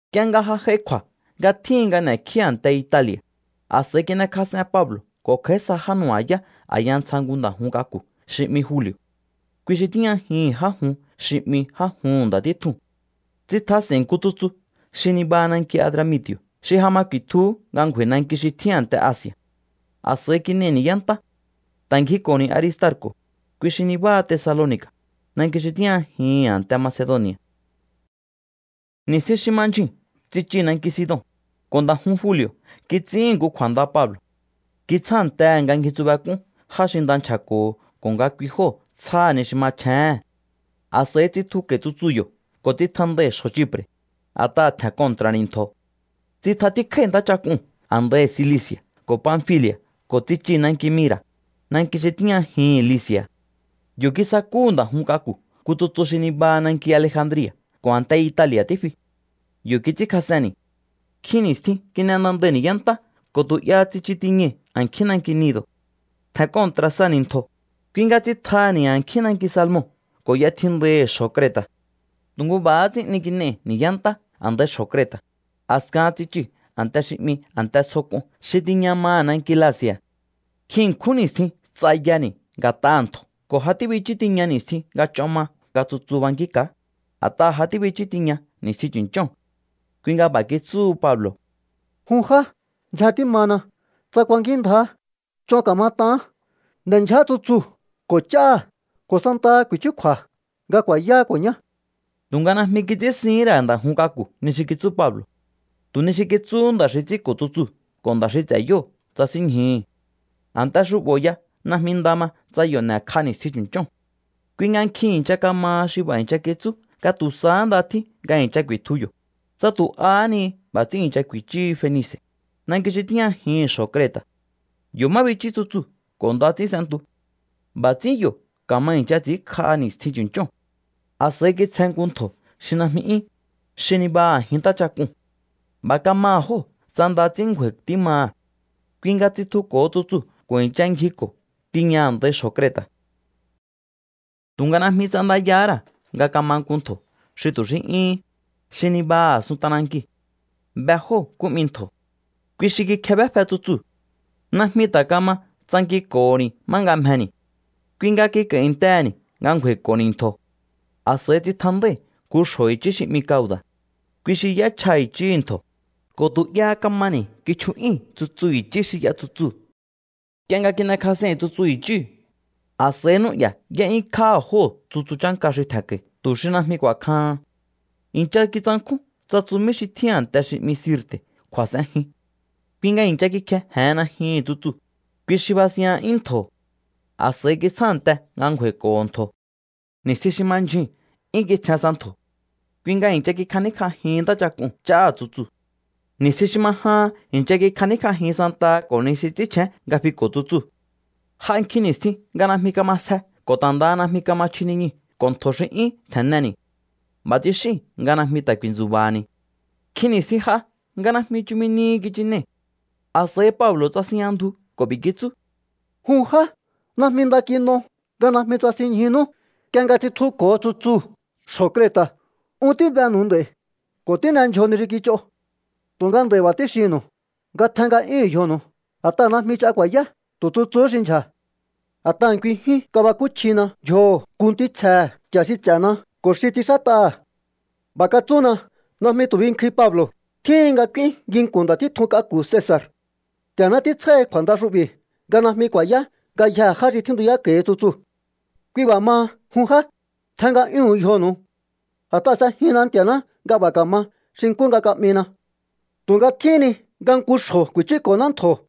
Nk'ie nga j'ai kju̱a̱ nga tjíhin nga n'e̱kjíni̱ a̱nte Itali̱a̱, a̱s'a̱i kin'ekjas'en Pablo̱ ko̱ kj'a̱í sa já nu̱ba̱yá a̱ya ntsja nku nda̱ jun k'aku̱ xi 'mi Juli̱o̱. Kui xi tíjñajihi̱n já jun xi 'mi Já juhu̱n Nda̱ títjuu̱n. Tsitjas'e̱i̱n nku tsutsu xi nibaha nanki Adramiti̱o̱ xi ja ma ku̱i̱tjuhú nga ngju̱a̱i̱ nanki xi tjín a̱nte Asi̱a̱. A̱s'a̱i kin'ei̱ ni̱yá ntá. Ta̱ ngjiko̱ni̱ Aristarco̱, kui xi nibáha Tesaloni̱ka̱, nanki xi tíjñajihi̱n a̱nte Macedoni̱a̱. Ni̱stjin xi ma ndyjuu̱n tsichii̱ nanki Sidon, ko̱ nda̱ jun Juli̱o̱ kits'íhi̱n nku kju̱a̱nda Pablo̱. Kitsjántehe̱ nga ngjitsubek'ún já xi nda nchja̱ko̱ho̱ ko̱ nga kui jóo̱ tsjáha̱ ni xi machjéhe̱n. A̱s'a̱i tsitjuko̱i̱ tsutsu yo̱ ko̱ tsitjandái̱ xjo̱ Chipre̱, a̱t'aha̱ tje̱n kontra̱ni̱ ntjo̱. Tsitjatíkjái̱ ntáchak'uu̱n a̱ndaihi̱ Cilici̱a̱ ko̱ Panfili̱a̱ ko̱ tsichii̱ nanki Mira̱, nanki xi tíjñajihi̱n Lici̱a̱. Yo̱ kisakúhu̱ nda̱ jun k'aku̱ nku tsutsu xi nibaha nanki Alejandria̱ ko̱ a̱nte Itali̱a̱ tífi. Yo̱ kits'ínkjas'enni̱. Nkjin ni̱stjin kin'e nda ndai̱ ni̱yá ntá ko̱ tu̱ 'yaha tsichu tiñai̱ a̱nkjín nanki Gnido̱. Tje̱n kontra̱ sani̱ ntjo̱, kui nga tsitjaha̱ni̱ a̱nkjín nanki Salmon ko̱ y'etjindaihi̱ xjo̱ Creta̱. Tu̱ nku b'a̱há ts'ín 'ni kin'ei̱ ni̱yá ntá a̱ndaihi̱ xjo̱ Creta̱. A̱skahan tsichii̱ nku a̱nte xi 'mi A̱nte Tsjo K'un xi tíjña maha̱ nanki Lasea̱. Nkjin ṉkjún ni̱stjin ts'ayani̱ nga̱t'aha̱ ntjo̱ ko̱ ja tíbichú tiña ni̱stjin nga ch'on ma nga tsutsu bankínka̱á, a̱t'aha̱ ja tíbichú tiña ni̱stjin chu̱nch'óo̱n. Kui nga b'a̱ kitsúhu Pablo̱: —Jun já, ndzjen tímana. Tsa kuankínndjaá, ch'on ka̱mat'aán. N'e̱ndyja tsutsuu̱ ko̱ ch'áha̱, ko̱ santaha kju̱i̱chúkju̱a̱ nga ku̱a̱yáá ko̱ ñá. Tu̱nga najmi kits'ínsihín ra̱ nda̱ jun k'aku̱ ni xi kitsú Pablo̱. Tu̱ ni xi kitsúhu nda̱ xi ts'ínko̱ tsutsuu̱ ko̱ nda̱ xi ts'e̱ yóo̱ tsasínñjuhu̱. A̱nte xu'bo̱ ya najmi nda ma tsa yo̱ n'e̱kj'a ni̱stjin chu̱nch'óo̱n. Kui nga nkjin i̱ncha kamaha xi b'a̱ i̱ncha kitsú nga tu̱ sahá nda tjín nga i̱ncha ku̱i̱tju yo̱, tsa tu̱ ahá ni b'a̱ ts'ín i̱ncha ku̱i̱chú Fenice̱, nanki xi tíjñajihi̱n xjo̱ Creta̱. Yo̱ má bichú tsutsu ko̱ nda ts'ín s'entu. B'a̱ ts'ín yo̱ ka̱ma i̱ncha ts'i̱ínkj'aha ni̱stjin chu̱nch'óo̱n. A̱s'a̱i kitsjen nku ntjo̱ xi najmi 'yún, xi nibaha a̱jin ntáchak'uu̱n. B'a̱ kamaha̱ jóo̱ tsa nda ts'ín ngju̱a̱i̱ tímaha̱. Kui nga tsitjuko̱ho tsutsuu̱ ko̱ i̱ncha ngjiko̱ tiña a̱ndai xjo̱ Creta̱. Tu̱nga najmi ts'andayahá ra̱ nga kama nku ntjo̱ xi tu̱ xí 'yúhún, xi nibaha a̱sun t'anankiu̱. Be jóo̱ nkú 'mi ntjo̱. Kui xi kikjebéfe tsutsuu̱. Najmi ta̱ kama tsankinko̱ho̱ni̱ má nga mjeni̱. Kui nga kik'a̱i̱ntehe̱ni̱ nga ngju̱a̱i̱ko̱ho̱ni̱ ntjo̱. A̱s'a̱i tsitjandái̱ nku xjo̱ i̱chí xi 'mi Cauda̱. Kui xi y'échjaha̱ i̱chí ntjo̱, ko̱ tu̱ 'yaha kamani̱ kichju'yúi̱n tsutsu i̱chí xi y'a tsutsuu̱. Nk'ie nga kin'ekjas'ei̱n tsutsu i̱chíu̱, a̱s'a̱i n'ú'ya̱ y'é'yúnkjáha̱ jóo̱ tsutsu chánka xi tje̱nko̱i̱ tu̱ xi najmi ku̱a̱kjahan. I̱ncha kitsankjún tsa tsumí xi tjín a̱nte xi 'mi Sirte̱ kju̱a̱s'enjin. Kui nga i̱ncha kikjeje̱hen najyuhu̱n tsutsuu̱, kui xi basinya'yún ntjo̱. A̱s'a̱i kitsjánte nga ngju̱a̱i̱ko̱ho̱ ntjo̱. Ni̱stjin xi ma ndyjuu̱n 'yún kitsjen sa ntjo̱. Kui nga i̱ncha kikjaníkj'ajin ntáchak'uu̱n ch'áha̱ tsutsuu̱. Ni̱stjin xi ma jahan i̱ncha kikj'aníkj'ajin santaha ko̱ ni xi ts'ínchjén nga fiko̱ tsutsuu̱. J'a nkjin ni̱stjin nga najmi kama sje ko̱ ta̱ ndaha najmi kama chji niñuu̱ ko̱ ntjo̱ xi 'yún tje̱nneni̱. B'a̱ tsixíi̱n nga najmi ta̱ ku̱i̱ntsu̱ba̱ha̱ni̱. Nkjin ni̱stjin j'a nga najmi chumi nihi kichinei̱. A̱s'a̱i Pablo̱ tsasinjña ndju ko̱ b'i̱ kitsú: —Jun já, najmi nda kin'o nga najmi tsasinñjunú, nk'ie nga tsitjuko̱o tsutsuu̱ xjo̱ Creta̱. Un tíbenu̱u nd'a̱i̱ ko̱ tín'e ndyjo ni xi kich'o. Tu̱nga nd'a̱i̱ b'a̱ tíxinnu̱u nga tjen nga'yúhu̱un yjonu̱u, a̱t'aha̱ najmi ch'a ku̱a̱yá. Tu̱ tsutsuu̱hú xi ndyja̱. A̱t'aha̱ nkui jyún kabakúchjina yjoho̱ nku ntítsjehe̱ Nti̱a̱ xi ts'e̱na ko̱ xi ts'inxát'aha̱. B'a̱ katsúna: “Najmi tu̱ binkjuin, Pablo̱. Tjíhin nga k'úín nginku̱n nda̱ títjun k'aku̱ Cesa̱r. Nti̱a̱ná títsjáhi̱ kju̱a̱nda xu'bi̱ nga najmi ku̱a̱yá ngayjee̱ já xi tjíntuyáko̱hi tsutsuu̱.” Kui b'a̱ maha, jun já, tjen nga'yúhu̱un yjonu̱u. A̱t'aha̱ s'ejinna Nti̱a̱ná nga b'a̱ ka̱ma xi nkú nga ka'mina. Tu̱nga tjíhín ni nga nku xjo̱ ku̱i̱chúko̱ná ntjo̱.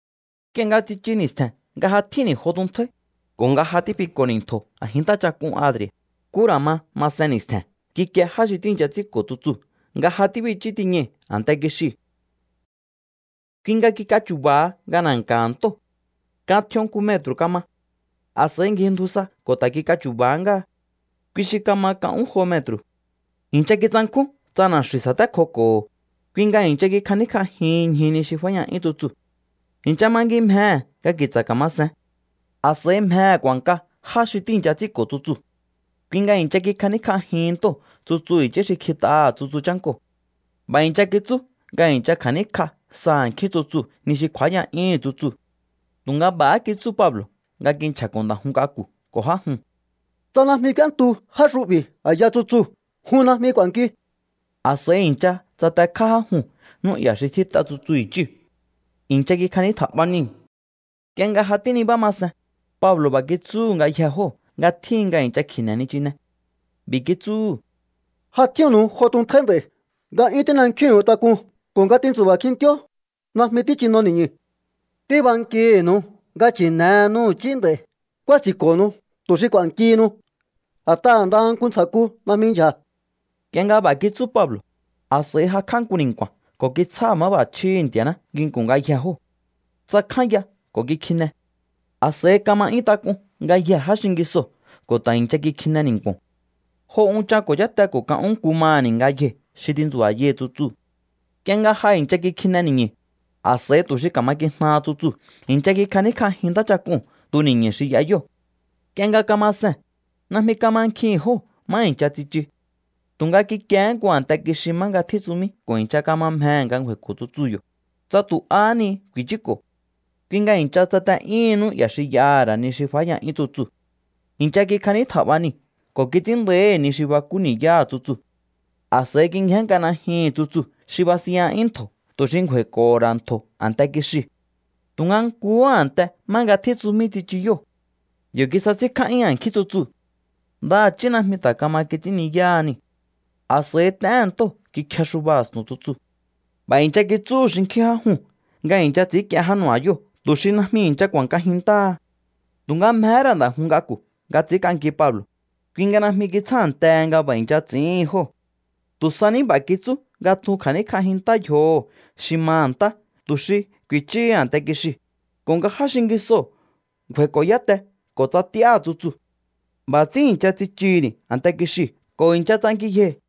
Nk'ie nga tsichu ni̱stje̱n nga ja tjínni̱ jo tuntjáí, ko̱ nga ja tífiko̱ni̱ ntjo̱ a̱jin ntáchak'un Adri̱a̱, nkú ra̱ ma masen ni̱stje̱n kikie já xi tíi̱ncha ts'ínko̱ tsutsuu̱ nga ja tíbichú tiñai̱ a̱nte kixiu̱. Kui nga kik'achu̱ba̱ha nga na̱nka̱ha̱ ntóo̱. Kan tj'ion nku metru̱ kama. A̱s'a̱i ngjindju sa ko̱ ta̱ kik'achu̱ba̱há ngáha. Kui xi kama kan ún jo metru̱. I̱ncha kitsankjún tsa na̱xi̱u̱ sa̱tékjoko̱ho̱, kui nga i̱ncha kikjaníkj'aha ñju ni xi fáya'yún tsutsuu̱. I̱ncha mangimjehe̱ nga ki̱tsa̱ ka̱ma sen. A̱s'a̱i mjehe̱ ku̱a̱nka já xi tíi̱ncha ts'ínko̱ tsutsuu̱. Kui nga i̱ncha kikjaníkj'ajihin ntóo̱ tsutsu i̱chí xi kjit'aha̱ tsutsu chánkoo̱. B'a̱ i̱ncha kitsú nga i̱ncha kja̱níkj'a sa a̱nkjín tsutsuu̱ ni xi kju̱áya'yúhu̱n tsutsuu̱. Tu̱nga b'a̱há kitsú Pablo̱ nga kinchja̱ko̱ nda̱ jun k'aku̱ ko̱ já juu̱n: —Tsa najmi k'úéntu já xu'bi̱ a̱ya tsutsuu̱, jun najmi k'u̱a̱nkiu. A̱s'a̱i i̱ncha tsatekjá já juu̱n n'ú'ya̱ xi tjít'a tsutsu i̱chíu̱. I̱ncha kikjanítja̱'ba niu̱. Nk'ie nga ja tínibá ma sen, Pablo̱ b'a̱ kitsúhu̱ ngayjee̱ jóo̱ nga tjíhin nga i̱ncha kji̱ne̱ nichine. B'i̱ kitsúhu̱: —Ja tjínnu̱u jo tuntjáí nd'a̱i̱ nga 'yún tín'enkjíhu̱un tak'un ko̱ nga tintsu̱ba̱ kjintíó. Najmi tíchino ni̱ñu̱. Tíbankihi̱nu̱u nga chi̱ne̱henu i̱chí nd'a̱i̱. Ku̱a̱si̱nko̱nu̱u tu̱ xi k'u̱a̱nkihinu. A̱t'aha̱ ndaha nku ntsja̱ku najmi ndyja̱. Nk'ie nga b'a̱ kitsú Pablo̱, a̱s'a̱i jakj'á nku ni̱nku̱a̱n ko̱ kitsjáha̱ máb'a̱chjíhi̱ Nti̱a̱ná nginku̱n ngayjee̱ jóo̱. Tsakjánya ko̱ kikjine. A̱s'a̱i kama 'yún tak'un ngayjee̱ já xingisoo̱ ko̱ ta̱ i̱ncha kikjine ni̱nku̱o̱n. Jo unchan ko̱ cháte ko̱ kan ún nku maha̱ni̱ ngayjei̱ xi tintsu̱ba̱yai̱ tsutsuu̱. Nk'ie nga ja i̱ncha kikjine ni̱ñu̱, a̱s'a̱i tu̱ xi ka̱ma kijnaha tsutsuu̱ i̱ncha kikjaníkj'ajin ntáchak'uu̱n tuni̱ñu̱ xi y'a yóo̱. Nk'ie nga kama see̱n, najmi kamankjihi̱n jóo̱ má i̱ncha tsichu. Tu̱nga kikiehé nku a̱nte kixi má nga tjín tsumí ko̱ i̱ncha kama mjehe̱ nga ngju̱a̱i̱ko̱ tsutsuu̱ yo̱, tsa tu̱ ahá ni ku̱i̱chúko̱. Kui nga i̱ncha tsate'yúhun n'ú'ya̱ xi y'aha̱ ra̱ ni xi fáya'yúhu̱n tsutsuu̱. I̱ncha kikjanítja̱b'a niu̱ ko̱ kits'ín nda̱íhi̱ ni xi bakú ni̱yáha̱ tsutsuu̱. A̱s'a̱i kingjénnk'a najyuhu̱n tsutsuu̱ xi basinya'yún ntjo̱ tu̱ xi ngju̱a̱i̱ko̱ho̱ ra̱ ntjo̱ a̱nte kixiu̱. Tu̱nga nkuhú a̱nte má nga tjín tsumí tsichu yóo̱. Yo̱ kisasínkjá'yún a̱nkjín tsutsuu̱. Ndaha̱chí najmi ta̱ kama kits'ínni̱yáha niu̱. A̱s'a̱i t'éhe̱n ntóo̱ kikjexuba a̱stu̱n tsutsuu̱. B'a̱ i̱ncha kitsúhu̱ xinkjín já juu̱n nga i̱ncha ts'i̱ínk'ien já nu̱ba̱yóo̱ tu̱ xi najmi i̱ncha ku̱a̱nkajin ntáha. Tu̱nga mjehé ra̱ nda̱ jun k'aku̱ nga ts'i̱ínk'anki Pablo̱, kui nga najmi kitsjántehe nga b'a̱ i̱ncha ts'i̱íhin jóo̱. Tu̱ sa ní b'a̱ kitsú nga tjun kja̱níkj'ajin ntá yjoho̱ xi maha̱ ntá tu̱ xi ku̱i̱chúhu a̱nte kixiu̱, ko̱ nga já xingisoo̱ ngju̱a̱i̱ko̱ yáte ko̱ tsa t'íáha̱ tsutsuu̱. B'a̱ ts'ín i̱ncha tsichuhu̱ni̱ a̱nte kixiu̱ ko̱ i̱ncha ts'ankiyjei̱.